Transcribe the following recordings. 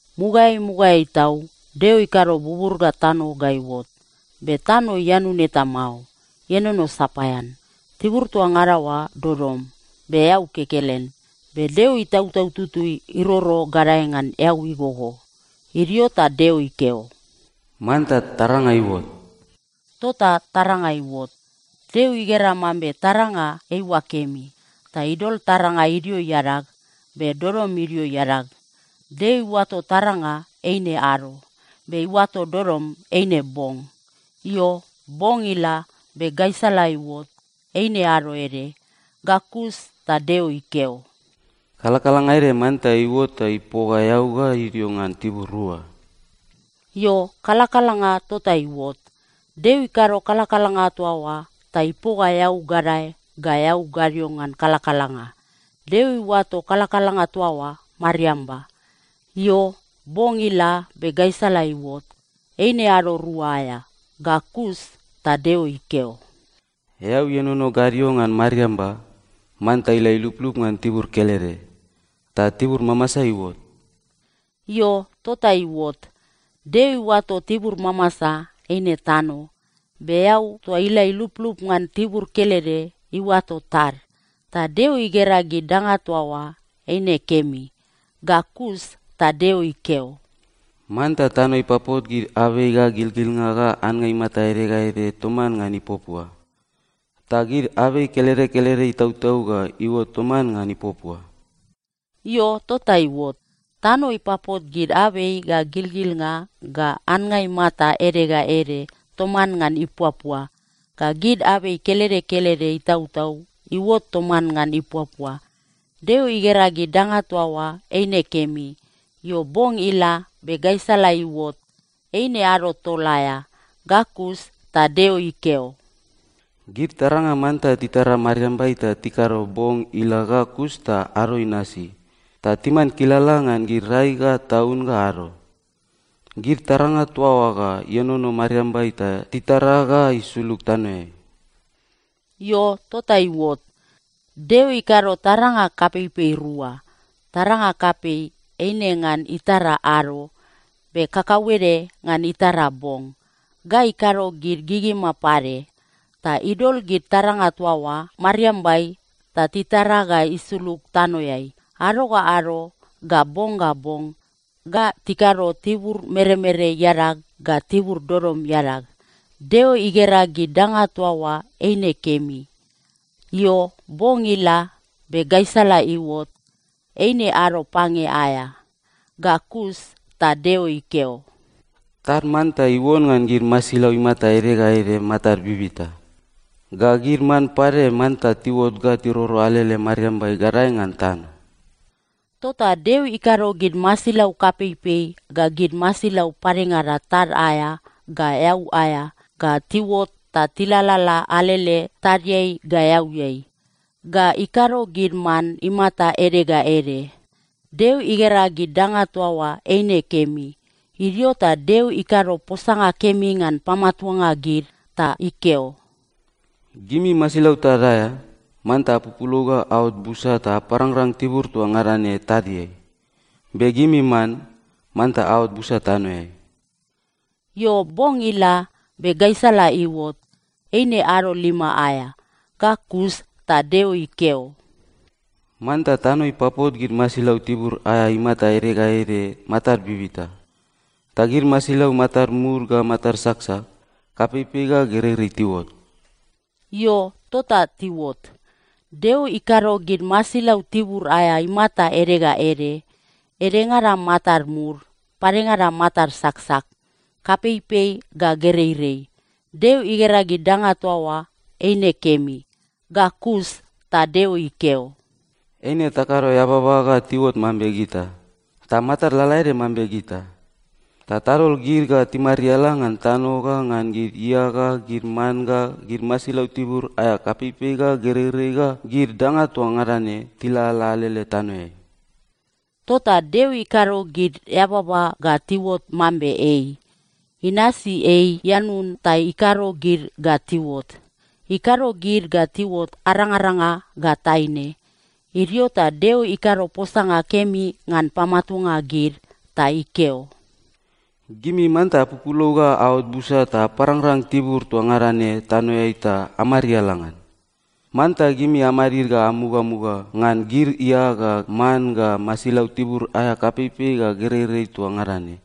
Mugaeai mugaeai tau, Deo ikado bubur ga tano ga iuot. Be tano ianun eta mao. Ienono sapaean. Tibur toa ngada oa dodom, be eau kekelen. Be Deo Itautau Tutui iroro gadae ngan eau igogo. Idio ta Deo ikeo, “Manta taranga iuot.” Tota taranga iuot. Deo igera mambe taranga eiua kemi. Ta idol taranga idio iadag, be dodom idio iadag. Deo iuato taranga eine “ado,” be iuato dodom eine “bong.” Io, bong ila, be gaisala iuot. Eine ado ede. Ga kus ta Deo ikeo, “Kalakalanga ede manta iuot ta ipoga eau ga idio ngan tibur rua.” Io, kalakalanga tota iuot. Deo ikado kalakalanga toa oa ta ipoga eau gadae ga eau gadio ngan kalakalanga. Deo iuato kalakalanga toa oa “mariamba.” Io, bong ila, be gaisala iuot. Eine ado rua aea. Ga kus ta Deo ikeo, “Eau ienono gadio ngan mariamba, manta ila iluplup ngan tibur kelede, ta tibur mamasa iuot.” Io, tota iuot. Deo iuato tibur mamasa eine “tano.” Be eau toa ila iluplup ngan tibur kelede, iuato “tad.” Ta Deo igera gid danga toa oa eine kemi. Ga kus ta Deo ikeo, “Manta tano ipapot gid abei ga gilgilnga ga annga imata ede ga ede toman ngan ipuapua. Ta gid abei kelede kelede itautau ga iuot toman ngan ipuapua.” Io, tota iuot. Tano ipapot gid abei ga gilgilnga ga annga imata ede ga ede toman ngan ipuapua. Ga gid abei kelede kelede itautau iuot toman ngan ipuapua. Deo igera gid danga toa oa eine kemi. Io, bong ila, be gaisala iuot. Eine ado tol aea. Ga kus ta Deo ikeo, “Gid taranga manta titara mariambai ta tikado bong ila ga kus ta ado inasi, ta timan kilala ngan gid rai ga taun ga ado. Gid taranga toa oa ga ienono mariambai ta titara ga isulug tanoeai.” Io, tota iuot. Deo ikado taranga kapeipei rua. Taranga kapei eine ngan itara ado, be kakauede ngan itara bong. Ga ikado gid gigima pade. Ta idol gid taranga toa oa mariambai ta titara ga isulug tanoeai ado ga ado ga bong ga bong. Ga tikado tibur meremere iadag ga tibur dodom iadag. Deo igera gid danga toa oa eine kemi. Io, bong ila, be gaisala iuot. Eine ado pange aea. Ga kus ta Deo ikeo, “Tad manta iuon ngan gid masilau imata ede ga ede matad bibita. Ga gid man pade manta tiuot ga tiroro alele mariambai gadae ngan tano.” Tota Deo ikado gid masilau kapeipei ga gid masilau padengada tad aea ga eau aea ga tiuot ta tilalala alele tadiai ga eauiai. Ga ikado gid man imata ede ga ede. Deo igera gid danga toa oa eine kemi. Idio ta Deo ikado posanga kemi ngan pamatuanga gid ta ikeo, “Gimi masilau tad aea, manta apupulou ga aot busa ta aparangrang tibur toa ngada ne tadiai. Be gimi man, manta aot busa tanoeai.” Io, bong ila, be gaisala iuot. Eine ado lima aea. Ga kus ta Deo ikeo, “Manta tano ipapot gid masilau tibur aea imata ede ga ede matad bibita, ta gid masilau matad mud ga matad saksak, kapeipei ga gereirei tiuot.” Io, tota tiuot. Deo ikado gid masilau tibur aea imata ede ga ede, edengada matad mud, padengada matad saksak, kapeipei ga gereirei. Deo igera gid danga toa oa eine kemi. Ga kus ta Deo ikeo, “Eine takado eababa ga tiuot mambe gita, ta matad lalaede mambe gita. Ta tadol gid ga timariala ngan tano ga ngan gid ia ga gid man ga gid masilau tibur aea kapeipei ga gereirei ga gid danga toa ngada ne tilalala alele tanoeai.” Tota Deo ikado gid eababa ga tiuot mambe ei. Inasi ei ianun ta ikado gid ga tiuot. Ikado gid ga tiuot arangaranga ga taine. Idio ta Deo ikado posanga kemi ngan pamatuanga gid ta ikeo, “Gimi manta apupulou ga aot busa ta aparangrang tibur toa ngada ne tanoeai ta amariala ngan. Manta gimi amadid ga amugamuga ngan gid ia ga man ga masilau tibur aea kapeipei ga gereirei toa ngada ne,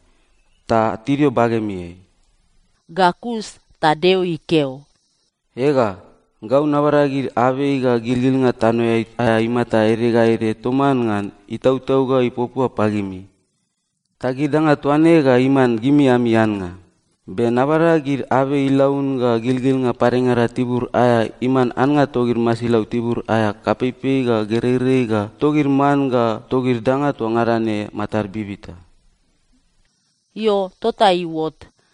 ta tidio bagemiai.” Ga kus ta Deo ikeo, “Ega, gau nabada gid abei ga gilgilnga tanoeai aea imata ede ga ede toman ngan itautau ga ipuapua pagimi, ta gid danga toa ne ga iman gimi ami annga. Be nabada gid abei ilaun ga gilgilnga padengada tibur aea iman annga togid masilau tibur aea kapeipei ga gereirei ga togid man ga togid danga toa ngada ne matad bibita.” Io, tota iuot.